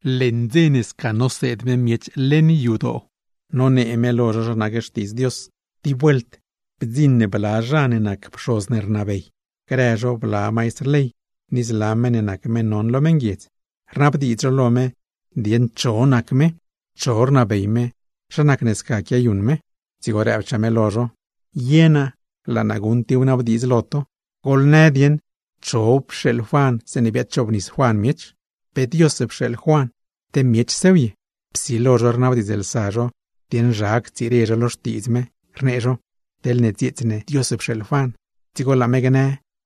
Leṉ dze ne sca noseed me miech leṉ yadoo, nonee me lo zho zha nac Xtiidz Dios, tib vuelt bdziṉ bla zha ne nac pxoz ne rnabey, grë zho bla maistr ley ni zla meṉ ne nac meṉ non lo meṉguiedz, rnabdiidz zho lo me dieṉ cho nac me, cho rnabey me, zha nacne sca quiayuṉ me. Dzigo rëbchaa me lo zho: ―Ye naa laa naa guṉ tib wnabdiidz lo to. Goḻnë dieṉ cho pxeeḻ Juan zeeṉe biadchoobnis Juan miech, ¿pe Dios pxeeḻ Juan, te miechsew ye? Psilo zho rnabdiidzlsa zho dieṉ zha ctsire zho lo xtiidz me, rnee zho: ―Teḻne dzieets ne Dios pxeeḻ Juan, dzigo laa me gnë: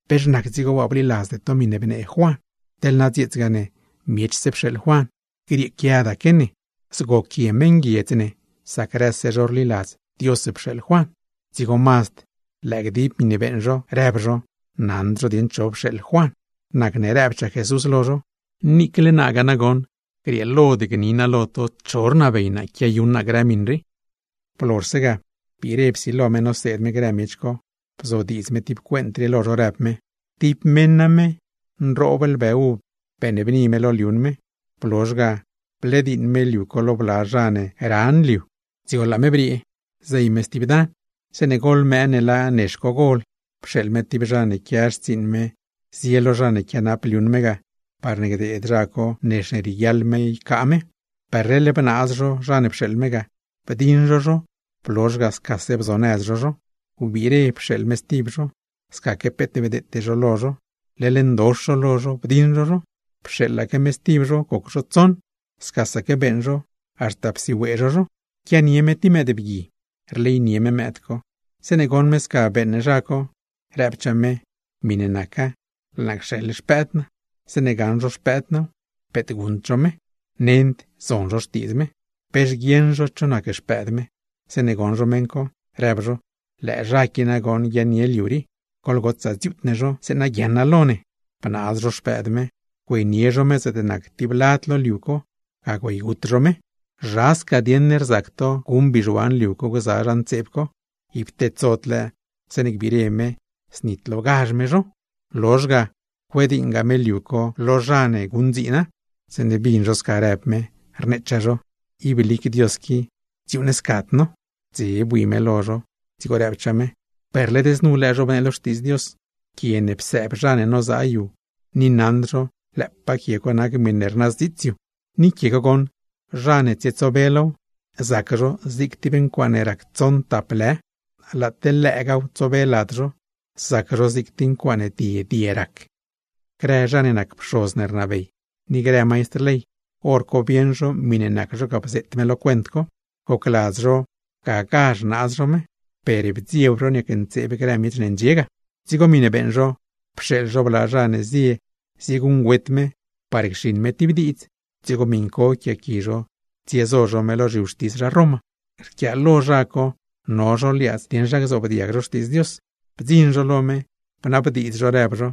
“¿Pex nac dzigo waa bliladzde to miṉe bnee Juan?” Teḻ na dzieetsgaa ne, miechse pxeeḻ Juan, grieequiadaque ne; zgoquie meṉguiedz ne, sac grëse zho rliladz Dios pxeeḻ Juan. Dzigo mazd lëë gdib miṉe beeṉ zho, rëb zho naṉd zho dieṉ cho pxeeḻ Juan. Nacne rëbchaa Jesús lo zho: ―Niicle naagaa nagoṉ, grieelod gni naa lo to cho rnabey naa quiayuṉ naa grë miṉ rii. Blozhse ga, biire psilo me noseed me grë miech co. Bzodiidz me tib cuent rii lo zho, rëb me: ―Tib meṉ name, nroob lbë uv beeṉbni me lo liuṉ me. Blozh ga blediiṉ me liu co lo bla zha ne ran liu, dzigo laa me briee ga, zey me stib dan. ’Zeeṉe goḻ mëë ne laa nex co gol, pxeeḻ me tib zha ne quia xtsiiṉ me zie lo zha ne quianap liuṉ me ga, parne gdeed zha co nex ne rieguiaḻ me ycaa me. Per leḻ bnaaz zho zha ne pxeeḻ me ga, bdiṉ zho zho, blozh ga scase bzonëz zho zho. Wbiire pxeeḻ me stib zho, scaque peet bdeete zho lo zho, leḻ ndox zho lo zho, bdiṉ zho zho. Pxeeḻaque me stib zho, goc zho tsoṉ, scasaque beeṉ zho, haxta psiwee zho zho. Quianie me tib mëëd, rleynie me mëëd co. Zeeṉe goṉ me sca beeṉ zha co, rëbchaa me: “Miṉe naca laa naa cxeḻ xpëëd naa, zeeṉe gaṉ zho xpëëd naaw, peet guṉd zho me, nend zon zho xtiidz me.” ’Pex guieṉ zho cho nac xpëëd me, zeeṉe goṉ zho meṉ co, rëb zho: “¡Lëë zha qui nagoṉ guiaaṉnie liu rii! ¡Goḻgotsaa dziuut ne zho, zeeṉa guiaaṉa lo ne!” Bnaaz zho xpëëd me, güeynie zho me zaatne nac tib lad lo liu co, ga güeygut zho me. ’¿Zha sca dieṉ rzac to guṉ bizhuan liu co gza zha ntseeb co? Ib tedsod lëë, zeeṉe gbire me, znitlogazh me zho. Lozhse ga, cuediiṉga me liuṉ me lo zla zha ne guṉdziina. Zeeṉe bin zho sca rëb me, rneechaa zho: ―¡Ib lic Dios qui, dziuuṉscad no! Dze bui me lo zho, dzigo rëbchaa me: ―Per led znu lëë, zhobnee lo Xtiidz Dios: “Quie ne psëëb zha ne nozaa yu, ni naṉd zho lëëpaa quie co nac miṉe rnazdziits yu.” ’Ni quie co goṉ, zha ne tsietsobe low, zac zho zig tib ncuaaṉe rac tsoṉ tap lë; laa teḻ lëëgaaw tsobe lad zho, zac zho zig tib ncuaaṉe die die rac. Grë zha ne nac pxoz ne rnabey, ni grë maistr ley, hor co bieṉ zho miṉe nac zho ga, bzeet me lo cuent co. ¡Gocladz zho gagazh naaz zho me! Per bdzieb zho, niacntseeb grë miech ne ndxie ga. Dzigo miṉe beeṉ zho, pxeeḻ zho bla zha ne zie zieguṉgüet me par cxiṉ me tib diidz, dzigo miṉ co yquiaaqui zho tsiezo zho me lo zhiwxtis zha Roma. Rquiaalo zha co, no zho liaadz dieṉ zha gzoobdiag zho xtiidz Dios, bdziṉ zho lo me, bnabdiidz zho rëb zho: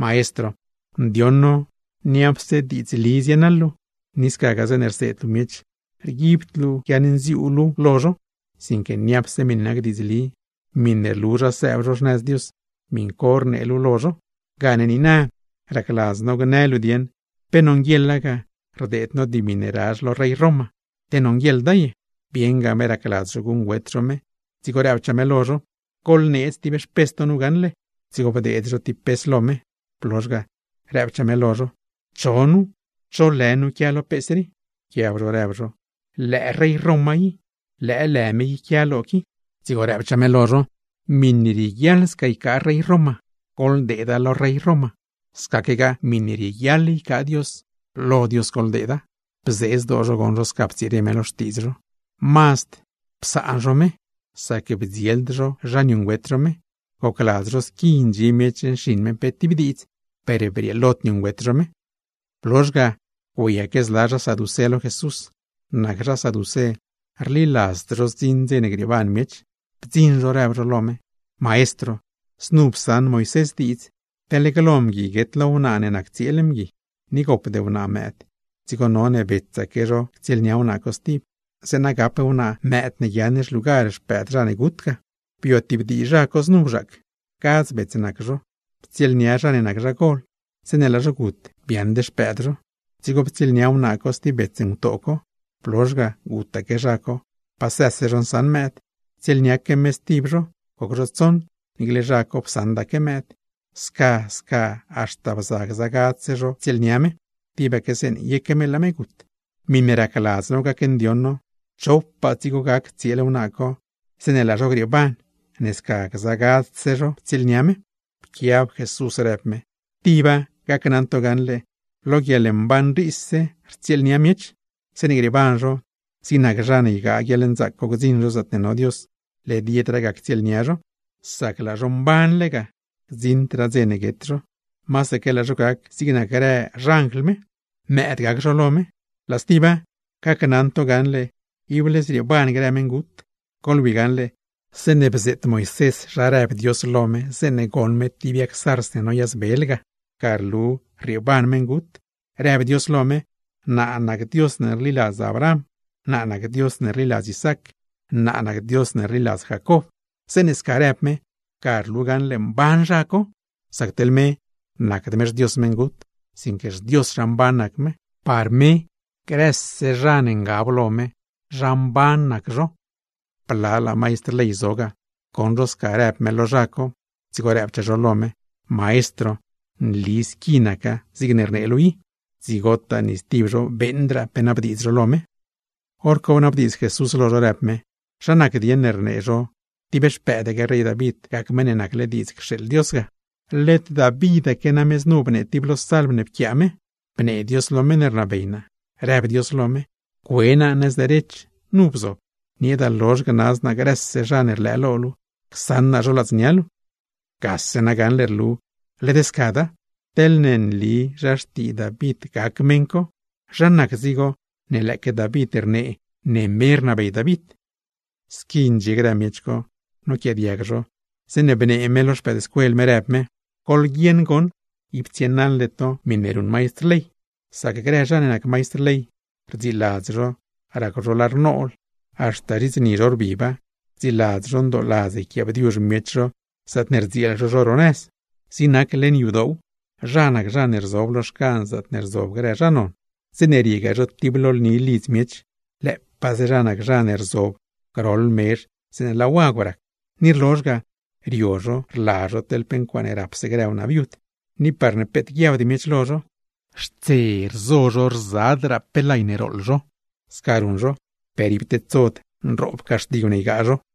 ―Maestro, ndioṉ no niapse diidzli zienaḻ luu, ni scagaa zeeṉe rseed luu miech, rguibd luu guiaṉnziuu luu lo zho, sinque niapse miṉe nac diidzli, miṉe rlu zha sëëb zho xnëz Dios, miṉ co rnee luu lo zho. Gane niina, racladz no gnë luu dieṉ pe nonguieḻa ga rdeed no dimi ne razh lo rey Roma, te nonguieḻda ye. Bieṉga me racladz zho guṉgüet zho me, dzigo rëbchaa me lo zho: ―¡Goḻneedz tib xpes to nu gaṉle! Dzigo bdeed zho tib pes lo me. Blozh ga, rëbchaa me lo zho: ―¿Cho nu? ¿Cho lë nu quia lo pes rii? Pquiab zho rëb zho: ―Lëë rey Roma i, lëë lë me i quia lo qui. Dzigo rëb me lo zho: ―Miṉe rieguiaḻ sca ycaa rey Roma, goḻdeeda lo rey Roma; scaquegaa miṉe rieguiaḻ ycaa Dios, lo Dios goḻdeeda. Bzee zdoo zho goṉ zho sca ptsire me lo xtiidz zho. Mazd dzese bre zho, sac bdzield zho zha niuṉgüet zho me; gocladz zho squi ndxie miech nxiṉ me pe tib diidz, per brieelod niuṉgüet zho me. Blozh ga, güeyaque zla zha saducé lo Jesús. Nac zha saducé rliladzd zho zdziṉ dze grieeban miech; bdziṉ zho, rëb zho lo me: ―Maestro, znu psaṉ Moisés diidz: teḻne glo mgui guet lo wnaa ne nac tsieel mgui, ni gopd wnaa mëëd, dzigo none betsaque zho ctsieelnia wnaa co stib, zeeṉa gap wnaa mëëd ne guiaaṉ xlugar xpëëd zha ne gut ga. ’Bio tib dii zha co znu bzhaac, gadz bets nac zho. Ptsieelnia zha ne nac zha gol, zeeṉe laa zho gut, biaaṉd xpëëd zho. Dzigo ptsieelnia wnaa co stib bets ngutoo co. Blozh ga, gutaque zha co, pa së zho nsaṉ mëëd. Ptsieelniaque me stib zho, goc zho tsoṉ, niicle zha co psaṉdaque mëëd. Sca sca haxta bza gza gadzse zho ptsieelnia me, tibaque zeeṉe yeque me laa me gut. Miṉe racladz no gacndioṉ no, ¿chopaa dzigo gac tsieel wnaa co, zeeṉe laa zho grieeban, ne sca gza gadzse zho ptsieelnia me? Pquiab Jesús rëb me: ―Tiba, gacnaṉ to gaṉle, lo guieḻmban riise rtsieelnia miech. Zeeṉe grieeban zho, zig nac zha ne ygaa guieḻnzaac gdziṉ zho zaatne no Dios, led yedraa ga ctsieelnia zho. Sac laa zho mbanle ga, gdziṉdraa dze guet zho. Masaque laa zho gac zig nac grë xanjl me, mëëd gac zho lo me. Laa stiba, gacnaṉ to gaṉle ible zrieeban grë meṉgut. Goḻwi gaṉle, zeeṉe bzeet Moisés zha rëb Dios lo me zeeṉe goṉ me tib yag zarz ne noyazbel ga; ga rlu rrieeban meṉgut. Rëb Dios lo me: “Naa nac Dios ne rliladz Abraham, naa nac Dios ne rliladz Isaac, naa nac Dios ne rliladz Jacob.” Zeeṉe sca rëb me, ga rlu gaṉle mban zha co. Sac teḻ me, nacd me xDios meṉgut, sinque xDios zha mban nac me. ¡Par me, grëse zha ne ngab lo me, zha mban nac zho! Blalaa maistr ley zo ga, goṉ zho sca rëb me lo zha co, dzigo rëbchaa zho lo me: ―Maestro, nli squi naca zigne rnee luu i. Dzigotaa ni stib zho beeṉdraa pe nabdiidz zho lo me. Horco bnabdiidz Jesús lo zho, rëb me: ―¿Zha nac dieṉ ne rnee zho tib xpëëdaque rey David gac Meṉ ne nacle diidz cxeeḻ Dios ga? Led Davitaque name znu bnee tib lo salm ne pquiaa me: Bnee Dios lo meṉ ne rnabey naa, rëb Dios lo me: “Cue naa nëz derech, nu bzob, nieeda lozh gnaz naa grëse zha ne rlëë lo luu, csaṉ naa zho ladznia luu.” Gase gaṉle rlu, led scada; teḻne nli zha xtii David gac meṉ co, ¿zha nac dzigo ne lëëque David rnee ne me rnabey David? Squi ndxie grë miech co noquiaadiag zho, zeeṉe bnee me lo xpëëdscuel me, rëb me: ―Goḻguieṉ goṉ, ib tsienaḻde to miṉe ruṉ maistr ley. Sac grë zha ne nac maistr ley, rdziladz zho racw zho lar nool, haxta zhits ni zho rbiba, rdziladz zho ndooladz rquiaabdiuzh miech zho zaatne rdzieel zho zho ro nëz. Zig nac leṉ yadoow, zha nac zha ne rzob lo xcan zaatne rzob grë zha non; zeeṉe riegaa zho tib lo lni lidz miech, lëëpaaze zha nac zha ne rzob groḻ mezh zeeṉe laa wagw rac. Ni rlozh ga, rio zho rla zho teḻ pe ncuaaṉe rapse grë wnaa viud; ni parne peet guiabd miech lo zho, xtse rzo zho rzadraa pe lay ne rooḻ zho. Sca ruṉ zho, ¡per ib tedsod nroob caxtigw ne ygaa zho!